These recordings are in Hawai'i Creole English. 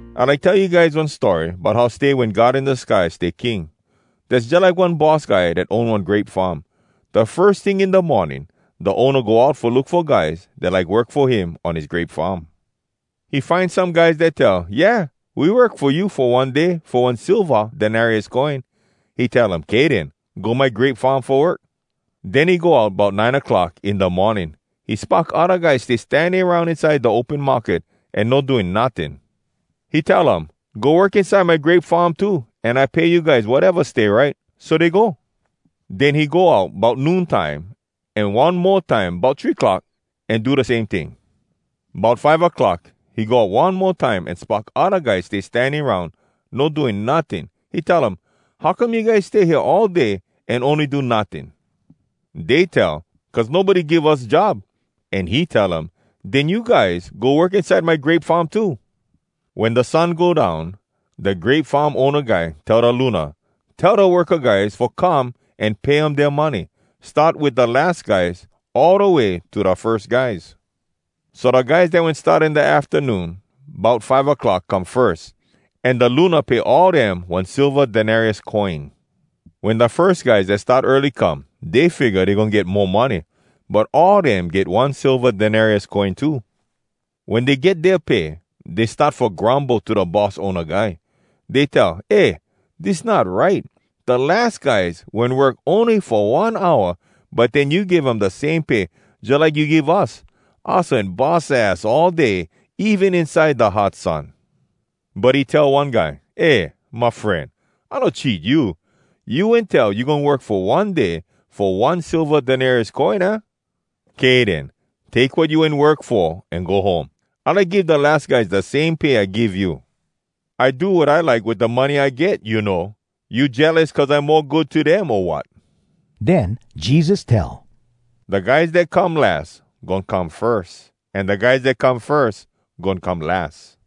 “I like tell you guys one story bout how stay wen God in da sky stay King. Dass jalike one boss guy dat own one grape farm. Da firs ting in da morning da owna go out fo look fo guys dat like work fo him on his grape farm. He find some guys dat tell, ‘Yeah, we work fo you fo one day fo one silva denarius coin.’ “He tell um, ‘Kay den, go my grape farm fo work.’ “Den he go out bout nine clock in da morning. He spock odda guys stay standing aroun inside da open market, an no doing notting. He tell um, ‘Go work inside my grape farm too, an I pay you guys wateva stay right.’ So dey go. Den he go out bout noon time an one mo time bout three clock, an do da same ting. “Bout five a clock he go out one mo time, an spock odda guys stay standing aroun, no doing notting. He tell um, ‘How come you guys stay hea all day an ony do notting?’ “Dey tell, ‘Cuz nobody give us job.’ An he tell um, ‘Den you guys go work inside my grape farm too.’ “Wen da sun go down, da grape farm owna guy tell da luna, ‘Tell da worka guys fo come, an pay um dea money. Start wit da las guys, all da way to da firs guys.’ So da guys dat wen start in da aftanoon bout five clock come firs, an da luna pay all dem one silva denarius coin. Wen da firs guys dat start early come, dey figga dey goin get mo money. But all dem get one silva denarius coin too. “Wen dey get dea pay, dey start fo grumble to da boss owna guy. Dey tell, ‘Eh, dis not right! Da las guys wen work ony fo one hour, but den you give dem da same pay, jalike you give us. Us wen bus ass all day, even inside da hot sun!’ “But he tell one guy, ‘Eh my fren, I no cheat you. You wen tell you goin work fo one day fo one silva denarius coin, aah? Kay den, take wat you wen work fo an go home. I like give da las guys da same pay I give you. I do wat I like wit da money I get, you know. You jealous cuz I mo good to dem, o wat?’” Den Jesus tell, “Da guys dat come las, goin come firs, an da guys dat come firs, goin come las.”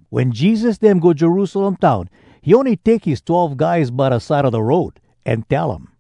Wen Jesus dem go Jerusalem town, he ony take his twelve guys by da side a da road, an tell um,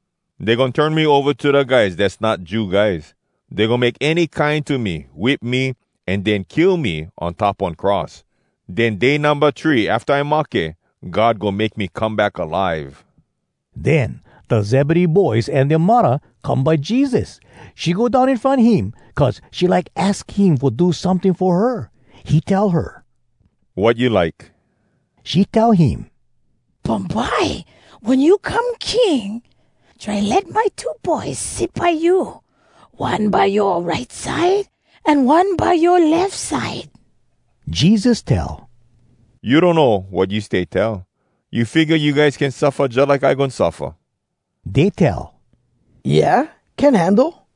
Dey goin turn me ova to da guys dass not Jew guys. Dey goin make any kine to me, whip me, an den kill me on top one cross. Den day numba three afta I mahke, God goin make me come back alive.” Den da Zebedee boys an dea muddah come by Jesus. She go down in front him, cuz she like aks him fo do someting fo her. He tell her, “Wat you like?” She tell him, “Bumbye wen you come king, try let my two boys sit by you, one by yoa right side, an one by yoa lef side.” Jesus tell, “You donno wat you stay tell. You figga you guys can suffa jalike I goin suffa?” Dey tell, “Yeah, can handle.”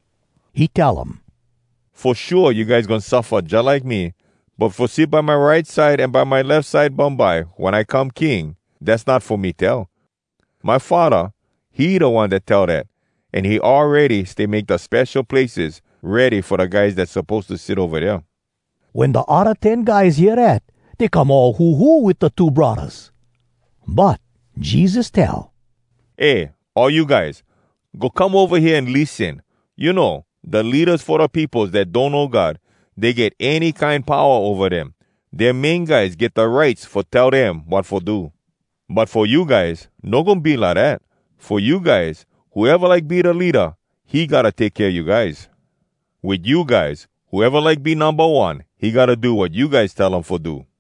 He tell um, “Fo shua you guys goin suffa jalike me. But fo sit by my right side an by my lef side bumbye wen I come King, dass not fo me tell. My Faddah, he da One dat tell dat, an he awready stay make da spesho places ready fo da guys dat suppose to sit ova dea.” Wen da odda ten guys hear dat, dey come all huhu wit da two braddahs. But Jesus tell, “Eh, all you guys! Go come ova hea an lissen! You know, da leadas fo da peopos dat donno God, dey get any kine powa ova dem. Dea main guys get da rights fo tell dem wat fo do. But fo you guys, no goin be lidat. Fo you guys, whoeva like be da leada, he gotta take kea you guys. Wit you guys, whoeva like be numba one, he gotta do wat you guys tell him fo do.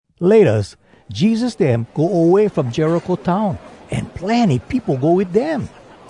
Laytas, Jesus dem go away from Jericho town, an plenny peopo go wit dem.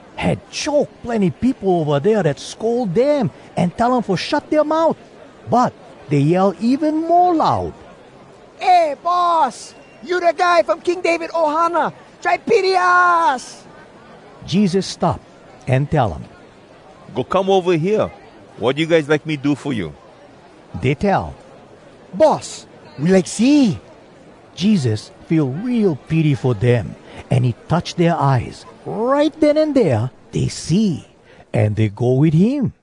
Had choke plenny peopo ova dea dat scold dem an tell um fo shut dea mout. But dey yell even mo loud, “Eh, Boss, you da guy from King David ohana! Try pity us!” Jesus stop an tell um, “Go come ova hea! Wat you guys like me do fo you?” Dey tell, “Boss! We like see!” Jesus feel real pity fo dem, an he touch dea eyes. Right den an dea, dey see, an dey go wit him.